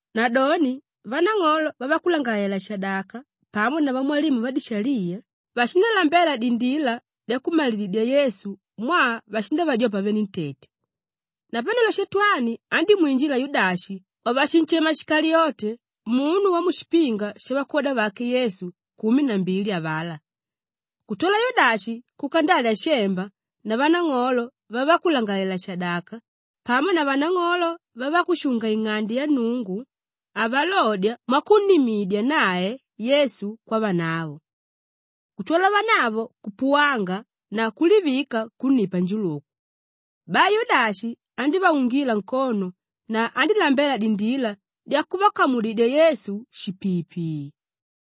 Nadoni vanang'olo vavakulangalalela-shadaka pamo na vamwalimu vadishaliya vashindalambela dindila dyakummalididya Yesu mwaa vashindavajopa venentete. Napanelo Shatwani andímwinjila Yudashi wavashinshema Shikaliyote munu wamushipinga shavakwoda vake Yesu kumi na mbili avalá. Kutwala Yudashi kuka ndalya shemba na vanang'olo vavakulangalalela-shadaka pamo na vanang'olo vavakushunga-ing'ande ya Nnungu avalodya mwakunnimidya nae Yesu kwavanavo. Kutwala vanavo kupuwanga na kulivika kunnipa njuluku. Bai Yudashi andívaungila nkono na andílambela dindila dyakuvakamudidya Yesu shipiipii.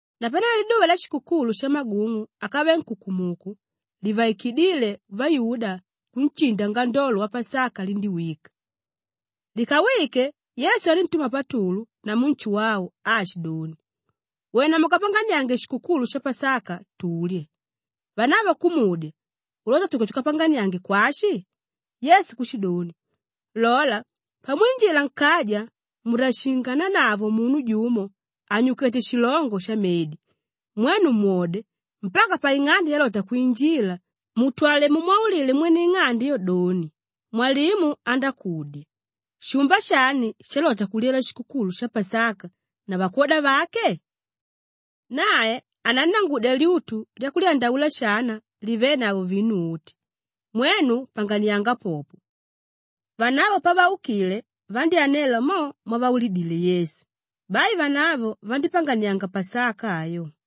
Napanelo liduva lyashikukulu shamagung'u ákave nkukumuku livaikidíle vayuda kunshinda ngandolo wapasaka lindíwika. Likawike, Yesu aníntuma Patulu namu Nshuwau aashidoni, “Wena mukapanganiange shikukulu sha Pasaka tulye.” Vanavo kumudya, “Ulota tuke tukapanganiange kwashi?” Yesu kushidoni, “Lola, pamwinjila nkaja mundashingananavo munu jumo ànyukete shilongo shamedi; mwenu mwode mpaka paing'ande yalota kwinjila mutwale mumwaulile mwene ing'ande ayo doni, ‘Mwalimu andákudya, Shumba shani shalota kulyela shikukulu sha Pasaka na vakwoda vake?’ Nae anannangudya lyutu lyakulyandaula shana livenavo vinu uti; mwenu panganianga popo.” Vanavo pavaukile vandyánela mo mwavaulilidile Yesu; bai vanavo vandípanganianga Pasaka ayo.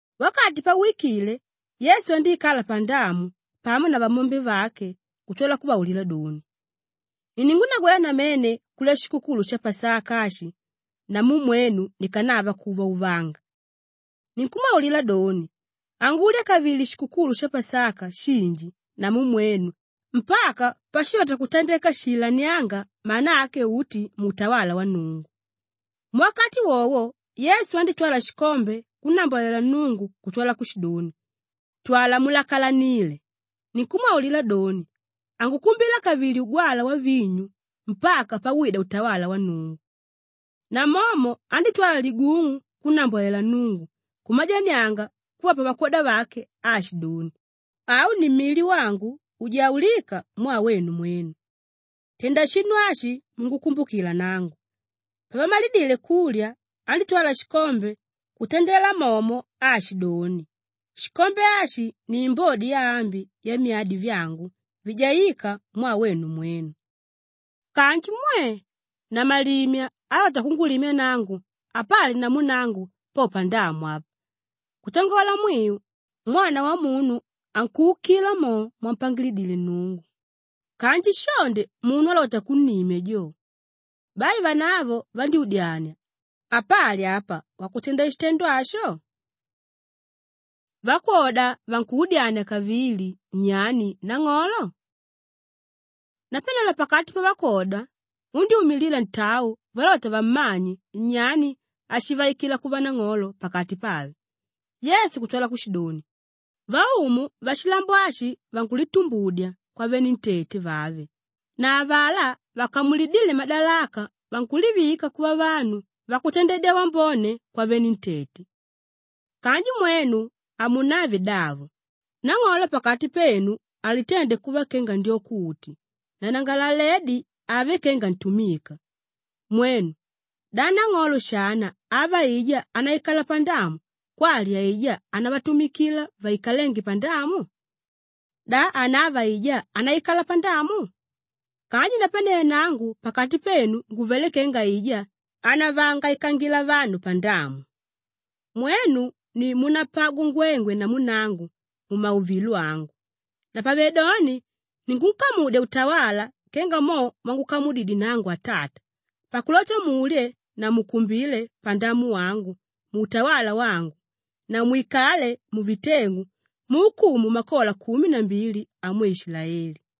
Wakati pauwikile, Yesu andíikala pandamu pamo na vamyombe vake kutwala kuvaulila doni, “Iningunagwela namene kulya shikukulu sha Pasaka ashi namu mwenu nikanava kuuvauvanga. Ninkumwaulila doni, hangulya kavili shikukulu sha Pasaka shinji namu mwenu mpaka pashilota kutandeka shiilanianga mana ake uti muutawala wa Nnungu.” Muwakati wowo Yesu andítwala shikombe kunnambwalela Nnungu kutwala kushidoni, “Twala mulakalanile. Ninkumwaulila doni, hangukumbila kavili ugwalwa wavinyu mpaka pawida utawala wa Nnungu.” Namomo andítwala ligung'u kunnambwalela Nnungu, kumajanianga kuvapa vakwoda vake aashidoni, “Au ni mili wangu ujaulíka mwaa wenu mwenu. Tenda shinu ashi mungukumbukila nangu.” Pavamalidile kulya, andítwala shikombe kutandela momo aashidoni, “Shikombe ashi ni imbodi yaambi yamyadi vyangu vijaíka mwaa wenu mwenu. “Kanji mwe! Namalimya álota kungulimya nangu, apali namu nangu po pandamu apa. Kutangola mwiu, Mwana Wamunu ankuukila mo mwampangilidile Nnungu kanji shonde munu álota kunnimya jo!” Bai vanavo vandyúdyania, “Apali apa wakutenda shitendo asho?” Vakwoda vankuudyania kavili, nyani nang'olo? Napanelo pakati pavakwoda undyúmilila ntau valota vammanye nyani áshivaikila kuva nang'olo pakati pave. Yesu kutwala kushidoni, “Vaumu vashilambo ashi vankulitumbudya kwavenentete vave na avalá vakamulidíle madalaka vankulivika kuva vanu vakutandedya wambone kwavenentete. Kanji mwenu hamunave davo; nang'olo pakati penu alitende kuva kenga ndyoko uti na nanangalaledi ave kenga ntumika. Mwenu! Da nang'olo shana ava aijá ánaikala pandamu kwali aijá ánavatumikila vaikalénge pandamu? Da hanava aijá ánaikala pandamu? Kanji napanelo nangu pakati penu nguvelé kenga aijá ánavaangaikangila vanu pandamu. “Mwenu ni múnapagwa ngwengwe namu nangu mumauvilo angu. Napavedoni ninkunkamudya utawala kenga mo mwangukamudididye nangu Atata pakulota mulye na mukumbile pandamu wangu muutawala wangu na mwikale muviteng'u muukumu makola kumi na mbili amwe Ishilaeli.”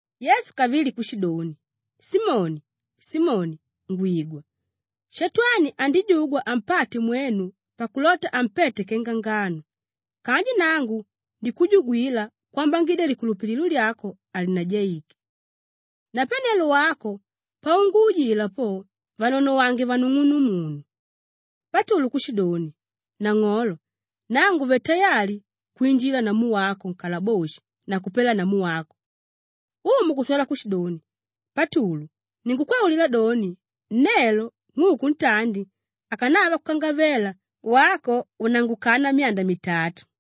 Yesu kavili kushidoni, “Simoni, Simoni, ngwigwa. Shatwani andijugwa ampate mwenu pakulota ampete kenga ngano. Kanji nangu ndikujugwila kwambangidya likulupililo lyako halinajaike. Napanelo wako paunguujila po, vanonowange vanung'unumunu.” Patulu kushidoni, “Nang'olo, nangu nguvelé tayali kwinjila namu wako nkalaboshi na kupela namu wako.” Umu kutwala kushidoni, “Patulu, ninkukwaulila doni, nelo ng'uku ntandi akanava kukangavela wako unangukana myanda mitatu.”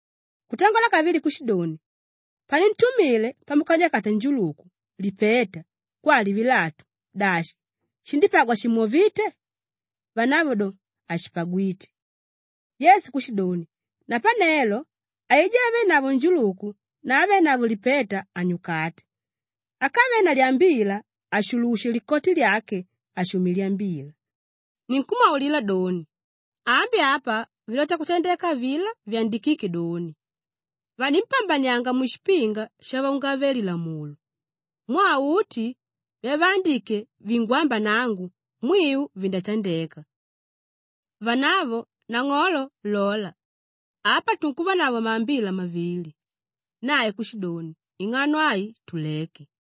Kutangola kavili kushidoni, “Panintumile pamukanyukata njuluku, lipeta kwali vilatu, dashi shindípagwa shimwovíte?” Vanavo do, “Hashipagwite.” Yesu kushidoni, “Napanelo aijá ávenavo njuluku na ávenavo lipeta anyukate. Ákave na lyambila, ashulushe likoti lyake ashume lyambila. Ninkumwaulila doni, ambi apa vilota kutandeka avilá vyandikíke doni, ‘Vanimpambanianga mushipinga shavaungave-lilamulo.’ Mwaa uti vyavaandike vingwamba nangu, mwiu vindatandeka.” Vanavo, “Nang'olo, lola! Apa tunkuvanavo maambila mavili.” Nae kushidoni, “Ing'ano ai tuleke.”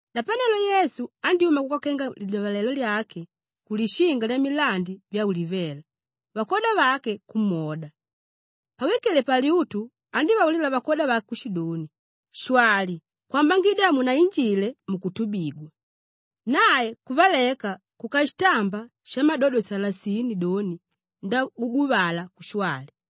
Napanelo Yesu andyúma kuka kenga lidyavalelo lyake ku Lishinga Lyamilandi Vyaulivela, vakwoda vake kumwoda. Pawikile palyutu, andívaulila vakwoda vake kushidoni, “Shwali kwambangidya hamunainjile mukutubigwa.” Nae kuvaleka kuka shitamba shamadodo salasini doni ndaguguvala kushwali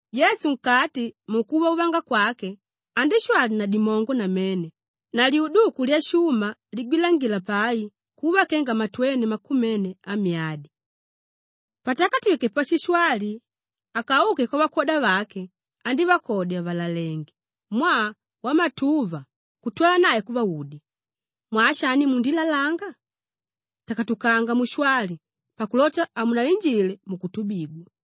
Yesu nkati mukuvauvanga kwake, andíshwali na dimongo namene na lyuduku lyashuma ligwilangila pai kuva kenga matweni makumene amyadi.] Patakatwike pashishwali akauke kwavakwoda vake, andívakodya vàlalenge mwaa wamatuva kutwala nae kuvaudya, “Mwaa shani mundilalanga? Takatukanga mushwali pakulota hamunainjile mukutubigwa.”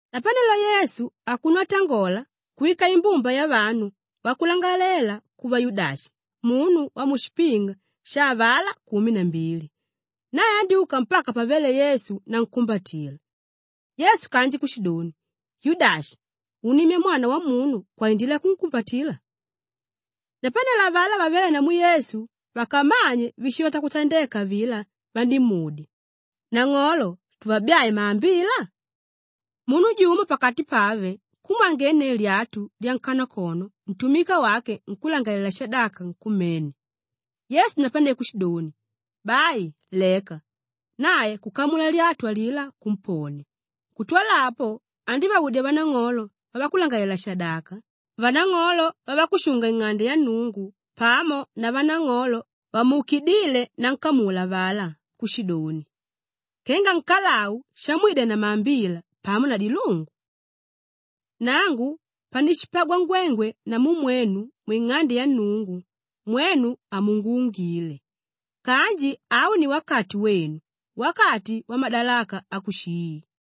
Napanelo Yesu akuno atangola kuwika imbumba yavanu wakulangalela kuva Yudashi munu wamushipinga sha avalá kumi na mbili; nae andyúka mpaka pavéle Yesu nankumbatila. Yesu kanji kushidoni, “Yudashi, unnimya Mwana Wamunu kwaindila yakumwambatila?” Napanelo avalá vavéle namu Yesu vakamanye víshilota kutandeka avilá vandímudya, “Nang'olo, tuvabyae maambila?” Munu jumo pakati pave kumwangenneu lyatu lyankanakono ntumika wake nkúlangalalela-shadaka nkumene. Yesu napane kushidoni, “Bai, leka.” Nae kukamula lyatu alilá kumponia. Kutwala apo, andívaudya vanang'olo vavakulangalalela-shadaka, vanang'olo vavakushunga-ing'ande ya Nnungu pamo na vanang'olo vamuukidíle nankamula avalá kushidoni, “Kenga nkalau shamwida na maambila pamo na dilungu? Nangu panishipagwa ngwengwe namu mwenu mwing'ande ya Nnungu, mwenu hamunguungile. Kanji au ni wakati wenu, wakati wamadalaka akushii.”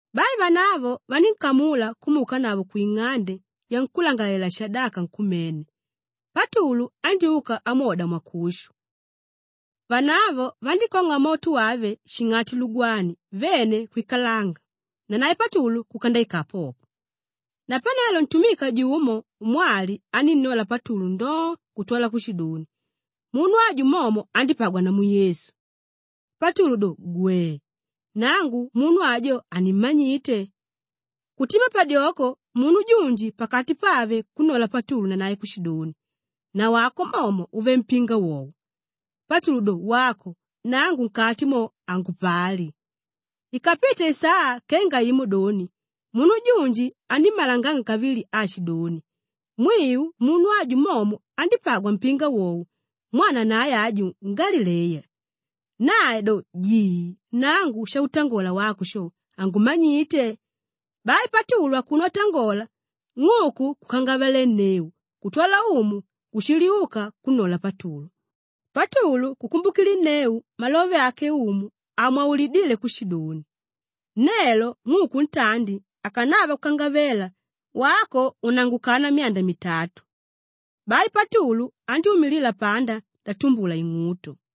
Bai vanavo vanínkamula kumuukanavo kwing'ande yankúlangalalela-shadaka nkumene; Patulu andyúka amwoda mwakushu. Vanavo vandíkong'a moto wave shing'ati lugwani vene kwikalanga nanae Patulu kuka ndaikala popo. Napanelo ntumika jumo mwali anínnola Patulu ndoo kutwala kushidoni, “Munu aju momo andípagwa namu Yesu.” Patulu doni, “Gwee! Nangu munu ajo hanimmanyite.” Kutima padyoko munu junji pakati pave kunnola Patulu nanae kushidoni, “Nawako momo uvelé mpinga wowo.” Patulu do, “Wako! Nangu nkati mo, hangupali.” Ikapite isaa kenga imo doni munu junji anímmalanganga kavili aashidoni, “Mwiu, munu aju momo andípagwa mpinga wowo mwaa nanae aju, ngalileya.” Nae do, “Jii! Nangu shautangola wako sho, hangumanyite.” Bai Patulu akuno atangola, ng'uku kukangavalenneu kutwala Umu kushiliuka kunnola Patulu, Patulu kukumbukilinneu malove ake Umu amwaulidíle kushidoni, “Nelo ng'uku ntandi akanava kukangavela wako unangukana myanda mitatu.” Bai Patulu andyúmila panda ndatumbula ing'uto.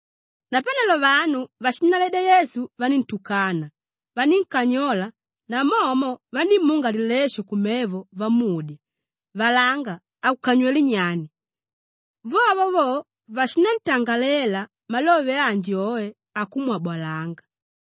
Napanelo vanu váshinnaledya Yesu vaníntukana, vanínkanyola namomo vandímunga lilesho kumevo vamudya, “Valanga, akukanywelé nyani?” Vovo vo vashinantangalela malove anji oe akumwabolanga.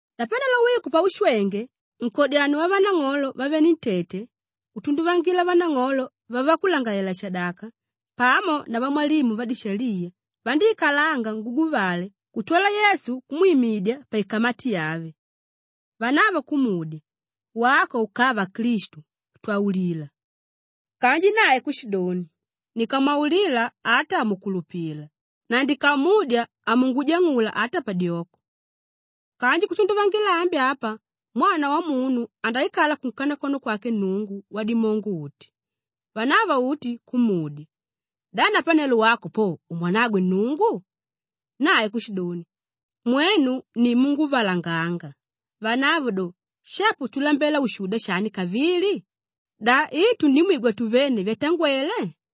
Napanelo wiku paushwenge, nkodyanio wavanang'olo vavenentete kutunduvangila vanang'olo vavakulangalalela-shadaka pamo na vamwalimu vadishaliya vandíikala nguguvale kuntwala Yesu kumwimidya paikamati yave. Vanavo kumudya, “Wako ukava Klistu, twaulila!” Kanji nae kushidoni, “Ndikamwaulila ata hamukulupila na ndikamudya hamungujang'ula ata padyoko. Kanji kutunduvangila ambi apa Mwana Wamunu andaikala kunkanakono kwake Nnungu Wadimongo-uti.” Vanavo uti kumudya, “Da napanelo wako po umwanagwe Nnungu?” Nae kushidoni, “Mwenu ni múnguvalanganga.” Vanavo do, “Shapo tulambela ushuda shani kavili? Da i tundimwigwa tuvene vyatangwele?”